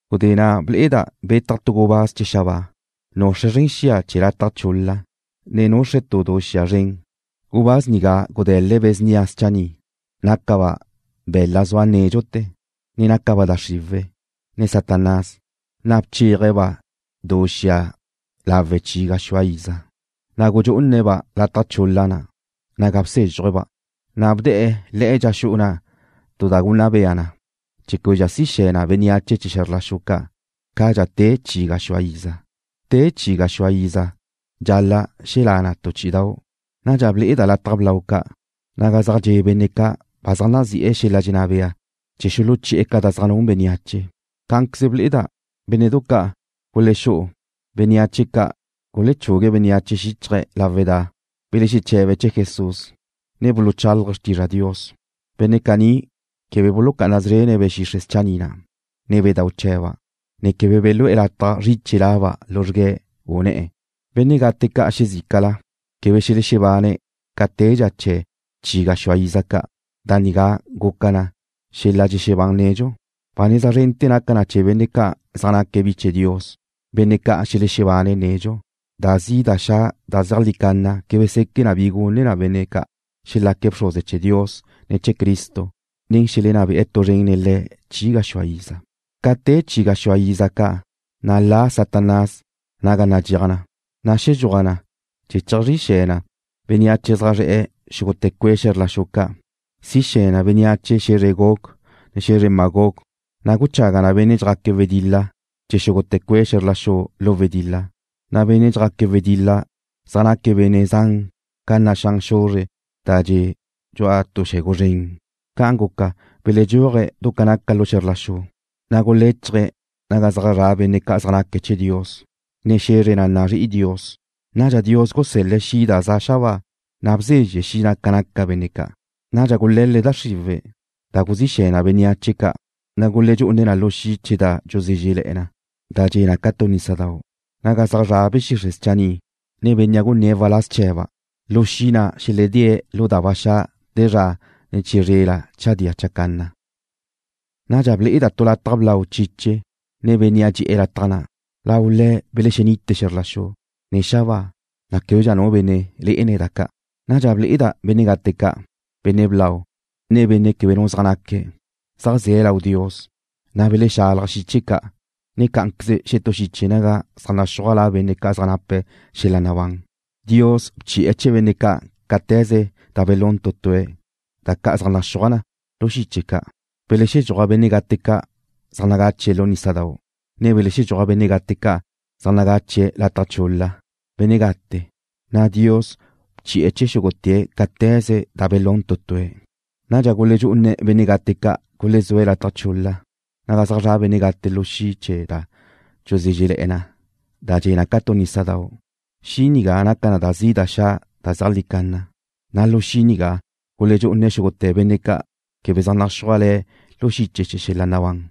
Gudé na' ble'eda' betaj tu gubáz chee̱ xabáa, nuxre̱' zren xia chee̱ lataj chul-la, ne nuxre̱' tu du xia zren. Gubáz nigá gude̱l-le̱' be̱ snia schanni', nácaba' be̱la' zua nédxute̱, ne nácaba' da xriwe̱', ne Satanás, na' bcheaje̱'-ba' du xia lawe' chi gaxúa iza. Na' gudxú'une̱'-ba' lataj chul-la na' naga bsézxuje̱'-ba', na' bde̱'e̱ le̱'e dxa xu'u na' tu da gunna bea na, chee̱ québedxa si xe̱ na bénneache chee̱ xe̱zr la xu ca' cadxa te chi gaxúa iza. Te chee̱ chi gaxúa iza, dxal-la' xelá' na tu chí'idau'. Nadxa ble'eda' lataj blau ca', naga zaj dxe' benne' ca' ba zaj nazi'e̱ xel-la' dxenná bea chee̱ xuluchi'e̱ ca da zaj nun bénneache. Cá'anqueze ble'eda' bénne'du ca' gulexú'u bénneache ca' gulechugu bénneache xíchaje̱' lawe' da belexeche̱be̱' chee̱ Jesús, ne buluchálaje̱' xrtizra Dios. Benne' caní quebe bulucá'ana szrene̱' be̱ xixre' schanni' na', ne bedau' chee̱ba', ne quebe belú'e̱ lataj zriche laba' luzrgue̱', u ne̱'e̱. Benne' gate ca' xezícala quebe xelexebane̱' ca tedxa chee̱ chi gaxúa iza ca'. Da nigá guca naca na xel-la' dxexebán nedxu. Ba neza zrente̱ naca na chee̱ benne' ca' zaj naque̱' bi chee̱ Dios, benne' ca' xelexebane̱' nedxu. Da zi' da xa' da zeajlí canna quebe seque' bi gune na benne' ca'. Xelaque̱' bxruze chee̱ Dios, ne chee̱ Cristo, na' xelenná be'e̱ tu zren nen Le̱' chi gaxúa iza. Ca te chee̱ chi gaxúa iza ca', na' la' Satanás naga nadxéaj na, na' xedxúaj na chee̱ cheajxrí xe̱ na bénneache zaj zre̱'e̱ xúgute̱ cue' xe̱zr la xu ca'. Si xe̱ na bénneache xe̱zre Gog, ne xe̱zre Magog, na' guchaga na benne' dxjaque̱' wedil-la chee̱ xúgute̱ cue' xe̱zr la xu lu wedil-la, na' benne' dxjaque̱' wedil-la zaj naque̱' benne' zan ca naxán xuzre' da dxe' dxu'a tu xe̱gu zren. Ca' guca, beledxúaje̱' du ca naca lu xe̱zr la xu, na' guléchaje̱' naga zaj zra' benne' zaj naque̱' chee̱ Dios, ne xe̱zre na' da nazrí'i Dios. Nadxa Dios gusel-le̱' xi' da za' xabáa, na' bzezxe xi' na' ca naca benne' ca'. Nadxa gule̱l-le̱' da xriwe̱', da guzí xe̱ na bénneache ca', na' guledxú'une̱' na lu xi' chee̱ da dxuzézrele̱'e na da dxe' ca tu nísadau', naga zaj zra' be̱ xixre' schanni', ne bénnea' gunné̱' waláz chee̱ba'. Lu xi' na' xeledée̱' lu da ba xa' te zra, ne chizrela chadía chacanna. Nadxa ble'eda' tu lataj blau chiche, ne Bénnea' dxe'e̱ lataj na'. Lau Le̱' belexenite xe̱zr la xu, ne xabáa, na' québedxa nu benne' lé'ene̱' da ca'. Nadxa ble'eda' benne' gate ca', benne' blau, ne benne' quebe nu zaj naque̱', zaj ze̱' lau Dios, na' belexalaj xiche ca', ne cá'anqueze xetú xiche naga zaj naxúaj la benne' ca' zaj nape̱' xel-la' nabán. Dios bchi'e̱ chee̱ benne' ca' cáte̱ze da belún tu tue̱', da ca' zaj naxúaj na lu xiche ca'. Belexedxúaj benne' gate ca' zaj nagache̱' lu nísadau', ne belexedxúaj benne' gate ca' zaj nagache̱' lataj chul-la chee̱ benne' gate, na' Dios bchi'e̱ chee̱ xúgute̱' cáte̱ze da belún tu tue̱'. Nadxa guledxú'une̱' benne' gate ca' gulezúe̱' lataj chul-la naga zra' benne' gate lu xi' chee̱ da dxuzézrele̱'e na da dxe' ca tu nísadau'. Xi' nigá naca na da zi' da xa' da zeajlí canna, na' lu xi' nigá guledxú'une̱' xúgute̱ benne' ca' quebe zaj naxúaj le̱' lu xiche chee̱ xel-la' nabán.